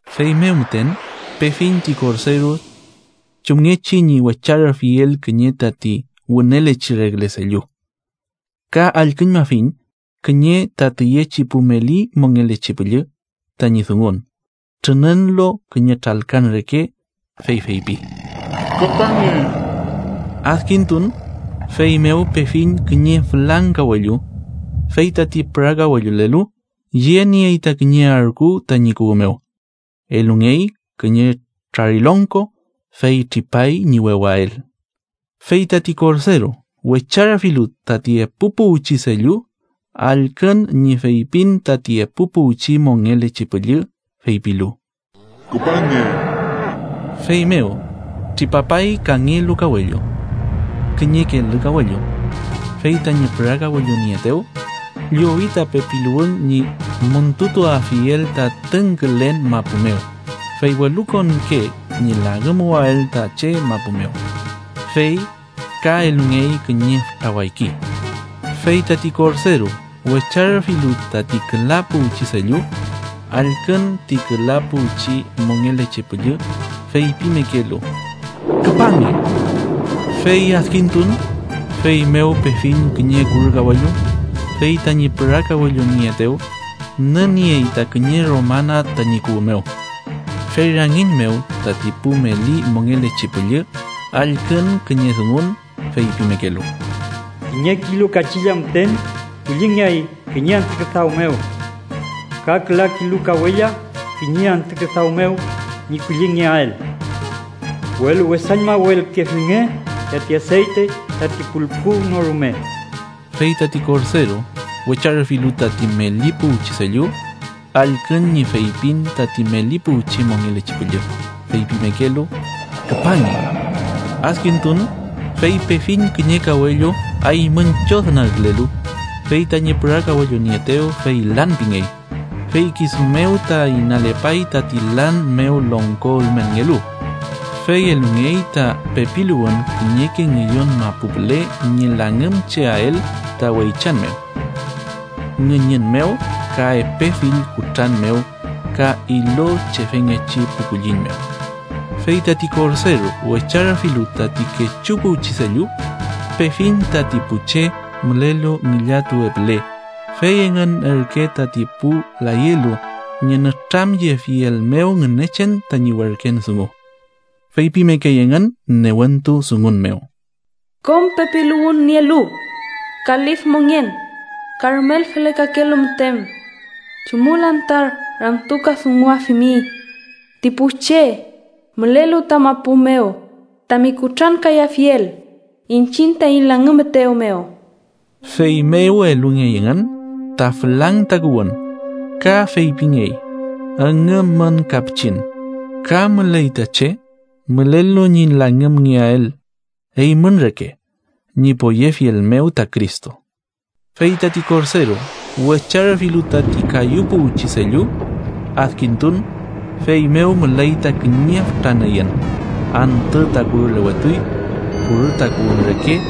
Feymew müten pefiñ ti Korderu chumngechi ñi wecharüfiel kiñe tati wünelechi regle sellu, ka allküñmafiñ kiñe ta tiyechi pu meli mongelechi püllü tañi dungun trününlu kiñe tralkan reke, fey feypi: “¡Küpange!” Adkintun, feymew pefiñ kiñe fülang kawellu, fey tati pürakawellulelu yeniey ta kiñe arku tañi kuwü mew. Elungey kiñe trarilongko, fey tripay ñi wewael. Fey tati Korderu wecharüfilu tati epu puwchi sellu, allkün ñi feypin tati epu puwchi mongelechi püllü feypilu: “¡Küpange!” Feymew tripapay kangelu kawellu. Kiñe kelü kawellu, fey tañi pürakawellunieetew llowi ta pepiluwün ñi müntutuafiel ta tüngkülen mapu mew, fey welukonke ñi langümuwael ta che mapu mew. Fey ka elungey kiñe fütra wayki. Fey tati Korderu wecharüfilu tati küla puwchi sellu, allkün ti küla puwchi mongelechi püllü feypimekelu: “¡Küpange!” Fey adkintun, feymew pefiñ kiñe kurü kawellu, fey tañi pürakawellunieetew nüniey ta kiñe romana tañi kuwü mew. Fey rangiñ mew tati pu meli mongelechi püllü allkün kiñe dungun feypimekelu: “Kiñe kilu kachilla müten kullingeay kiñe antü küdaw mew, ka küla kilu kawella kiñe antü küdaw mew ñi kullingeael, welu wesañmawelkefilnge tati aseyte tati pulku no rume.” Fey tati Korderu wecharüfilu tati meli puwchi sellu, allkün ñi feypin tati meli puwchi mongelechi püllü, feypimekelu: “¡Küpange!” Adkintun, fey pefiñ kiñe kawellu aymüñ chodnagkülelu, fey tañi pürakawellunieetew fey lan pingey. Fey kisu mew ta inalepay tati lan mew longko ülmenngelu, Fey elungey ta pepiluwün kiñeke ngüyon mapu püle ñi langümcheael ta weychan mew, ngüñün mew, ka epe fill kutran mew ka ilochefengechi pu kulliñ mew. Fey tati Korderu wecharüfilu tati kechu puwchi sellu, pefiñ tati pu che mülelu ngillatuwe püle, fey engün ürke tati pu layelu ñi nütramyefiel mew Ngünechen tañi werken dungu. Feypimekey engün newentu dungun mew: “Kom pepiluwün nielu ka lif mongen ka rumel felekakelu müten, ¿chumül anta ramtukadunguafimi ti pu che mülelu ta mapu mew tami kutrankayafiel iñchiñ taiñ langümetew mew?” Feymew elungey engün ta fülang takuwün, ka feypingey: üngümmün ka pichin, ka müley ta che mülelu ñi langümngeael eymün reke ñi poyefiel mew ta Cristo. Fey tati Korderu wecharüfilu tati kayu puwchi sellu, adkintun, feymew müley ta kiñe fütra nüyün. Antü ta kurülewetuy, kurü takuwün reke;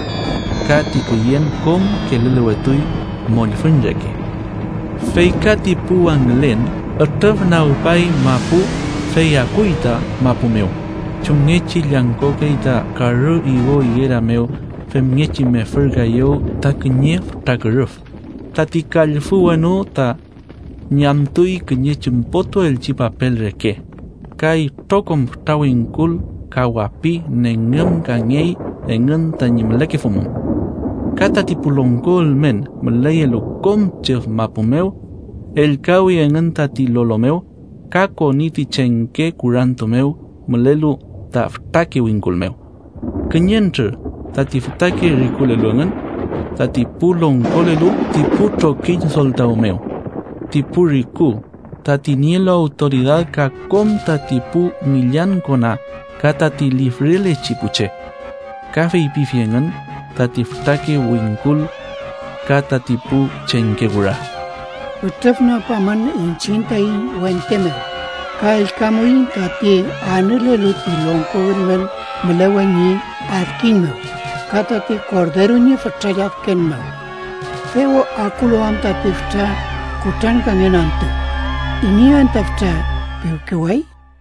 ka ti küyen kom kelülewetuy, mollfüñ reke, fey ka ti pu wangülen ütrüfnagpay mapu, fey akuy ta mapu mew chumngechi llangkokey ta karü igo igera mew femngechi mefürkaeyew ta kiñe fütra kürüf. Tati kallfü wenu ta ñamtuy kiñe chümpotuelchi papel reke, ka itrokom fütra wingkul ka wapi nengümkangey engün tañi mülekefumun. Ka tati pu longko ülmen müleyelu kom chüf mapu mew ellkawi engün tati lolo mew ka koni ti chengke kurantu mew mülelu ta fütrake wingkul mew, kiñentrür tati fütake rikulelu engün, tati pu longkolelu ti pu trokiñ soltaw mew, ti pu riku, tati nielu awtoridad ka kom tati pu ngillan kona ka tati lifrelechi pu che. Ka feypifi engün tati fütrake wingkul ka tati pu chengke kura: “¡Ütrüfnagpamün iñchiñ taiñ wente mew ka ellkamuiñ tati anülelu ti longko ülmen mülewe ñi adkiñ mew, ka tati Korderu ñi fütra lladken mew! Dew akulu am tati fütra kutrankangen antü, ¿iney anta fütra piwkeway?”